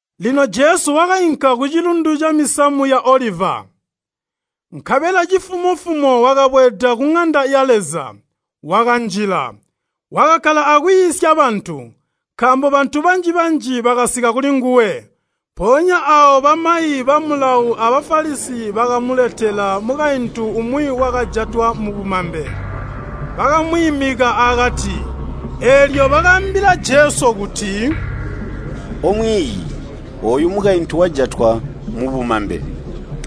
Lino Jesu wakainka kucilundu camisamu ya Oliva. Nkabela cifumo-fumo wakabweeda kuŋanda ya Leza, wakanjila. Wakakkala akwiisya bantu, nkaambo bantu banji-banji bakasika kulinguwe. Mpoonya aawo bamayi ba Mulawo a Bafalisi bakamuletela mukaintu umwi wakajatwa mubumambe. Bakamwiimika akati. Eelyo bakaambila Jesu kuti, “Omwiiyi, ooyu mukaintu wajatwa mubumambe.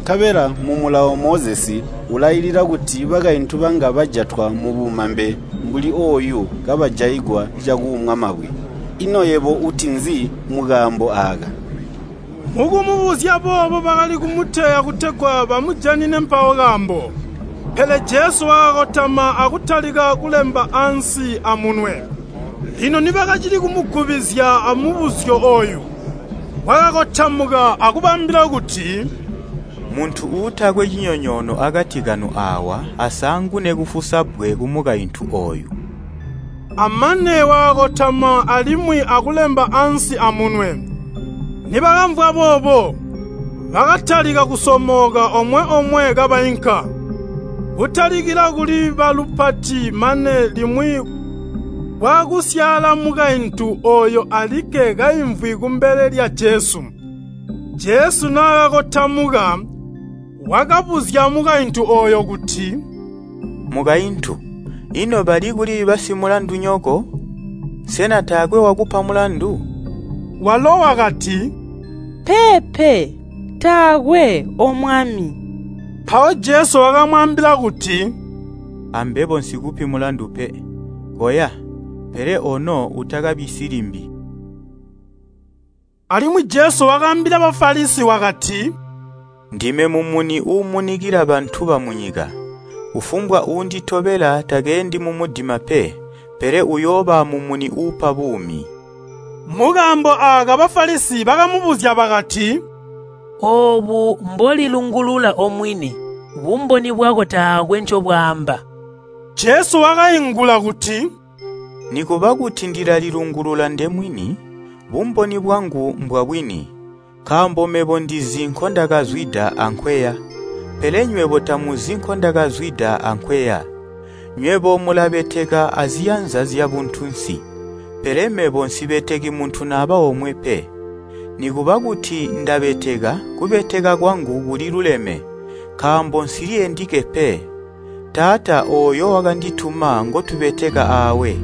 Nkabela mu Mulawo Mozesi ulailila kuti bakaintu banga bajatwa mubumambe mbuli ooyu kabajaigwa cakuumwa mabwe. Ino yebo uti nzi mukaambo aaka?” Mukumubuzya boobo bakali kumuteya kutegwa bamujanine mpawo kaambo. Pele Jesu wakakotama akutalika kulemba ansi amunwe. Lino nibakacili kumugubizya amubuzyo ooyu, wakakotamuka akubaambila kuti, “Muntu uutakwe cinyonyoono akati kanu aawa asaangune kufusa bbwe kumukaintu ooyu.” Amane wakakotama alimwi akulemba ansi amunwe. Nibakamvwa boobo, bakatalika kusomooka omwe-omwe kabainka, kutalikila kuli balupati mane limwi kwaakusyaala mukaintu ooyo alikke kaimvwi kumbele lya Jesu. Jesu naakakotamuka, wakabuzya mukaintu ooyo kuti, “Mukaintu, ino balikuli basimulandunyoko? Sena taakwe wakupa mulandu?” Walo wakati, “Peepe, taakwe, O Mwami.” Mpawo Jesu wakamwaambila kuti, “Ambebo nsikupi mulandu pe. Koya, pele ono utakabisyi limbi!” Alimwi Jesu wakaambila Bafalisi wakati, “Ndime mumuni uumunikila bantu bamunyika. Kufumbwa uunditobela takeendi mumudima pe, pele uyooba amumuni uupa buumi.” Mukaambo aaka Bafalisi bakamubuzya bakati, “Oobu mbolilungulula omwini, bumboni bwako taakwe ncobwaamba.” Jesu wakaingula kuti, “Nikuba kuti ndilalilungulula ndemwini, bumboni bwangu mbwabwini, nkaambo mebo ndizi nkondakazwida ankweya. Pele nywebo tamuzi nkondakazwida ankweya. Nywebo mulabeteka aziyanza zyabuntunsi, pele mebo nsibeteki muntu naba omwe pe. Nikuba kuti ndabeteka, kubeteka kwangu kuliluleme, nkaambo nsili endike pe, Taata ooyo wakandituma ngotubeteka aawe.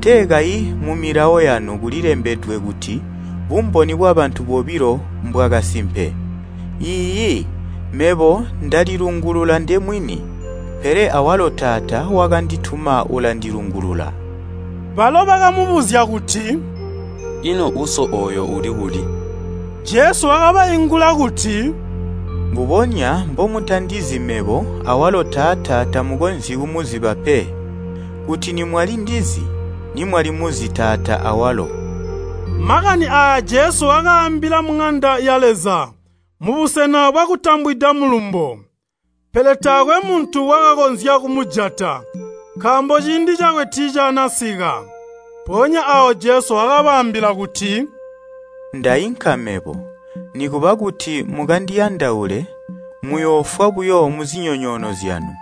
Tee kayi mumilawo yanu kulembedwe kuti bumboni bwabantu bobilo mbwakasimpe. Iiyi mebo ndalilungulula ndemwini, pele awalo Taata wakandituma ulandilungulula.” Balo bakamubuzya kuti, “Ino Uso ooyo uli kuli?” Jesu wakabaingula kuti, “Mbubonya mbomutandizi mebo awalo Taata tamukonzyi kumuziba pe. Kuti nimwali ndizi, nimwalimuzi Taata awalo.” Makani aaya Jesu wakaambila muŋanda ya Leza, mubusena bwakutambwida mulumbo. Pele taakwe muntu wakakonzya kumujata, nkaambo ciindi cakwe tiicaanasika. Mpoonya aawo Jesu wakabaambila kuti, “Ndainka mebo. Nikuba kuti mukandiyandaule, muyoofwa buyo muzinyonyoono zyanu.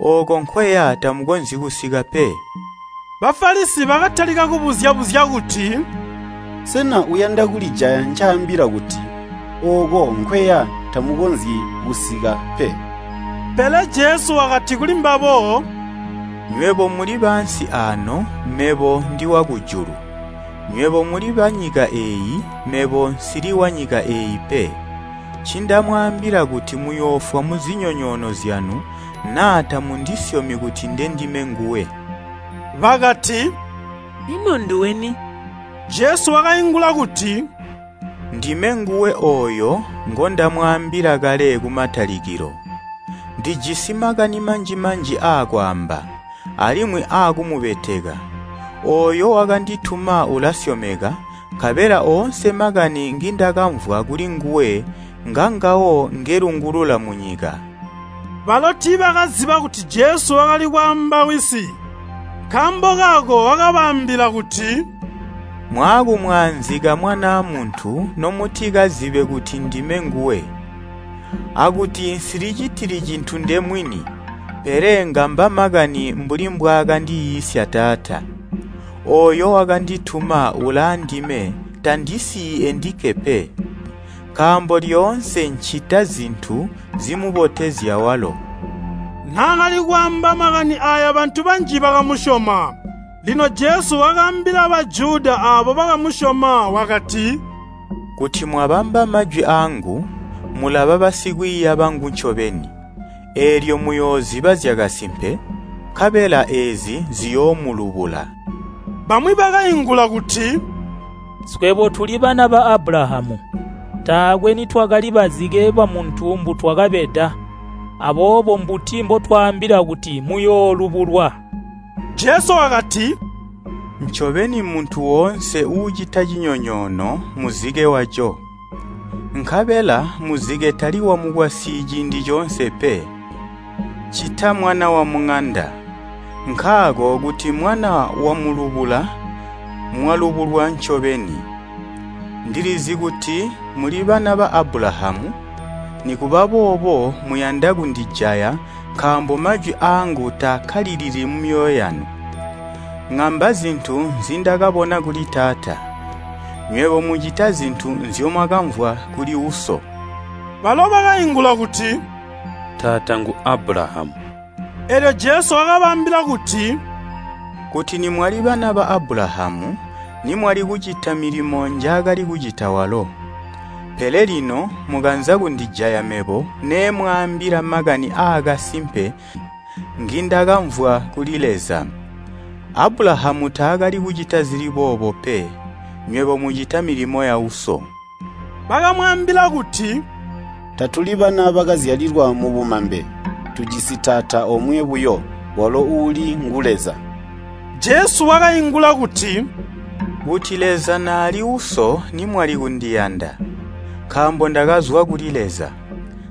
Ooko nkweya tamukonzyi kusika pe.” Bafalisi bakatalika kubuzya-buzya kuti, “Sena uyanda kulijaya ncaambila kuti, ‘Ooko nkweya tamukonzyi kusika pe.’” Pele Jesu wakati kulimbabo, “Nywebo muli baansi aano mebo ndi wakujulu. Nywebo muli banyika eeyi, mebo nsili wanyika eeyi pe. Ncindamwaambila kuti muyoofwa muzinyonyoono zyanu naa tamundisyomi kuti ndendime nguwe.” Bakati, “Ino nduweni?” Jesu wakaingula kuti, “Ndime nguwe ooyo ngondamwaambila kale kumatalikilo. Ndijisi makani manji-manji aakwaamba, alimwi aakumubeteka. Ooyo wakandituma ulasyomeka, nkabela oonse makani ngindakamvwa kulinguwe ngangawo ngelungulula munyika.” Balo tiibakaziba kuti Jesu wakalikwaamba Wisi. Nkaambo kaako wakabaambila kuti, “Mwaakumwaanzika Mwanaa Muntu nomutikazibe kuti ndime nguwe, akuti nsilicitili cintu ndemwini, pele ngamba makani mbuli mbwaakandiiisya Taata. Ooyo wakandituma ulaandime, tandisiyi endike pe, nkaambo lyoonse nncita zintu zimubotezya walo.” Naakali kwaamba makani aaya bantu banji bakamusyoma. Lino Jesu wakaambila Bajuda aabo bakamusyoma, wakati, “Kuti mwabamba majwi aangu, mulaba basikwiiya bangu ncobeni. Eelyo muyooziba zyakasimpe, nkabela eezi, ziyoomulubula.” Bamwi bakaingula kuti, “Swebo tuli bana ba Abulahamu, taakwe nitwakali bazike bamuntu mbutwakabeda. Aboobo mbuti mbotwaambila kuti, muyoolubulwa?” Jesu wakati, “Ncobeni muntu woonse uucita cinyonyoono muzike waco. Nkabela muzike tali wamukwasyi ciindi coonse pe, ccita mwana wamuŋanda. Nkaako kuti mwana wamulubula, mwalubulwa ncobeni. Ndilizi kuti muli bana ba Abulahamu, nikuba boobo muyanda kundijaya nkaambo majwi aangu taakkalilili mumyoyo yanu. Ngamba zintu nzindakabona kuli Taata, nywebo mucita zintu nzyomwakamvwa kuli uso.” Balo bakaingula kuti, “Taata ngu Abulahamu.” Eelyo Jesu wakabaambila kuti, “Kuti nimwali bana ba Abulahamu nimwali kucita milimo njaakali kucita walo. Pele lino mukanza kundijaya mebo neemwaambila makani aakasimpe ngindakamvwa kuli Leza. Abulahamu taakali kucita zili boobo pe. Nywebo mucita milimo ya uso.” Bakamwaambila kuti, “Tatuli bana bakazyalilwa mubumambe, tujisi taata omwe buyo, walo uuli ngu Leza.” Jesu wakaingula kuti, “Kuti Leza naali Uso nimwali kundiyanda, nkaambo ndakazwa kuli Leza.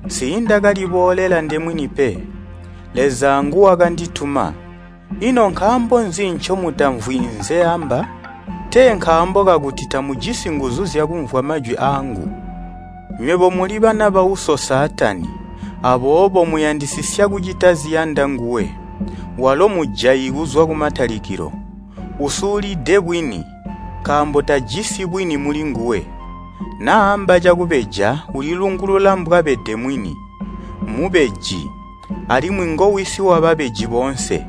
Nsiindakaliboolela ndemwini pe, Leza nguwakandituma. Ino nkaambo nzi ncomutamvwi nzeamba? Tee nkaambo kakuti tamujisi nguzu zyakumvwa majwi aangu? Nywebo muli bana bauso Saatani, aboobo muyandisisya kucita ziyanda nguwe. Walo mujayi kuzwa kumatalikilo. Usulide bwini, nkaambo tajisi bwini mulinguwe. Naamba cakubeja ulilungulula mbwabede mwini, mmubeji, alimwi ngowisi wababeji boonse.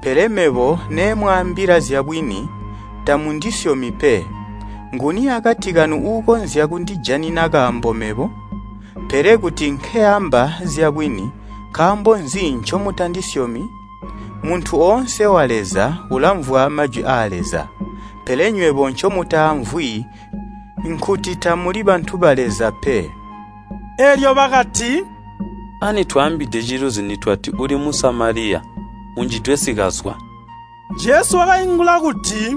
Pele mebo nemwaambila zyabwini, tamundisyomi pe. Nguni akati kanu uukonzya kundijanina kaambo mebo? Pele kuti nkeamba zyabwini, nkaambo nzi ncomutandisyomi? Muntu oonse wa Leza ulamvwa majwi aa Leza. Pele nywebo ncomutaamvwi nkuti tamuli bantu ba Leza pe.” Eelyo bakati, “Ani twaambide ciluzi nitwati, ‘Uli Musamaliya, unjidwe sikazwa?’” Jesu wakaingula kuti,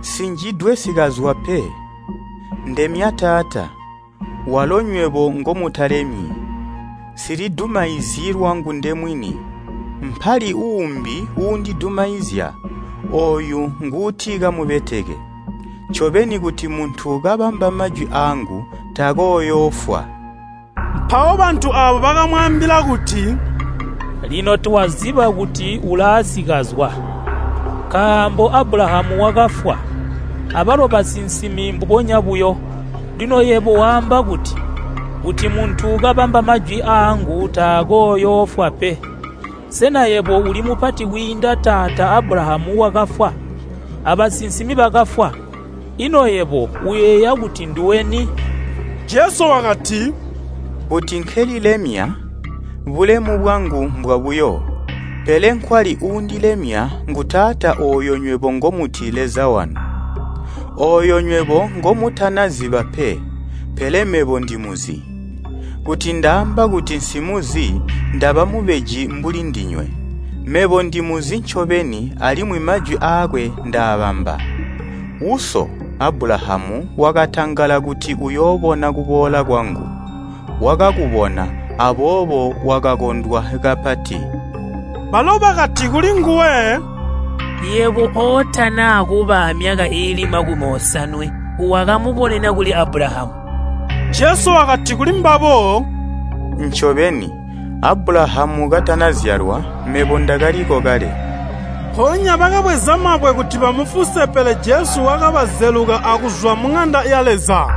“Nsinjidwe sikazwa pe. Ndemya Taata. Walo nywebo ngomutalemyi. Nsilidumaizyi lwangu ndemwini. Mpali uumbi uundidumaizya, ooyu nguuti kamubeteke. Ncobeni, kuti muntu kabamba majwi aangu, takooyoofwa.” Mpawo bantu aabo bakamwaambila kuti, “Lino twaziba kuti ulaasikazwa, nkaambo Abulahamu wakafwa, abalo basinsimi mbubonya buyo, lino yebo waamba kuti, ‘Kuti muntu kabamba majwi aangu takooyoofwa pe.’ Sena yebo uli mupati kwiinda taata Abulahamu wakafwa? Abasinsimi bakafwa? Ino yebo uyeeya kuti nduwe ni?” Jesu wakati, “Kuti nkelilemya, bulemu bwangu mbwabuyo. Pele nkwali uundilemya ngu Taata ooyo nywebo ngomuti Leza wanu. Ooyo nywebo ngomutana ziba pe, pele mebo ndimuzi. Kuti ndaamba kuti nsimuzi ndaba mubeji mbuli ndinywe. Mebo ndimuzi ncobeni alimwi majwi aakwe ndaabamba. Uso, Abulahamu wakatangala kuti uyoobona kuboola kwangu. Wakakubona, aboobo wakakondwa kapati.” Balo bakati kulinguwe, “Yebo ootana kuba amyaka iili makumi osanwe, wakamubonena kuli Abulahamu?” Jesu wakati kulimbabo, “Ncobeni, Abulahamu katanazyalwa, mebo ndakaliko kale.” Mpoonya bakabweza mabwe kuti bamufuse pele Jesu wakabazeluka akuzwa muŋanda ya Leza.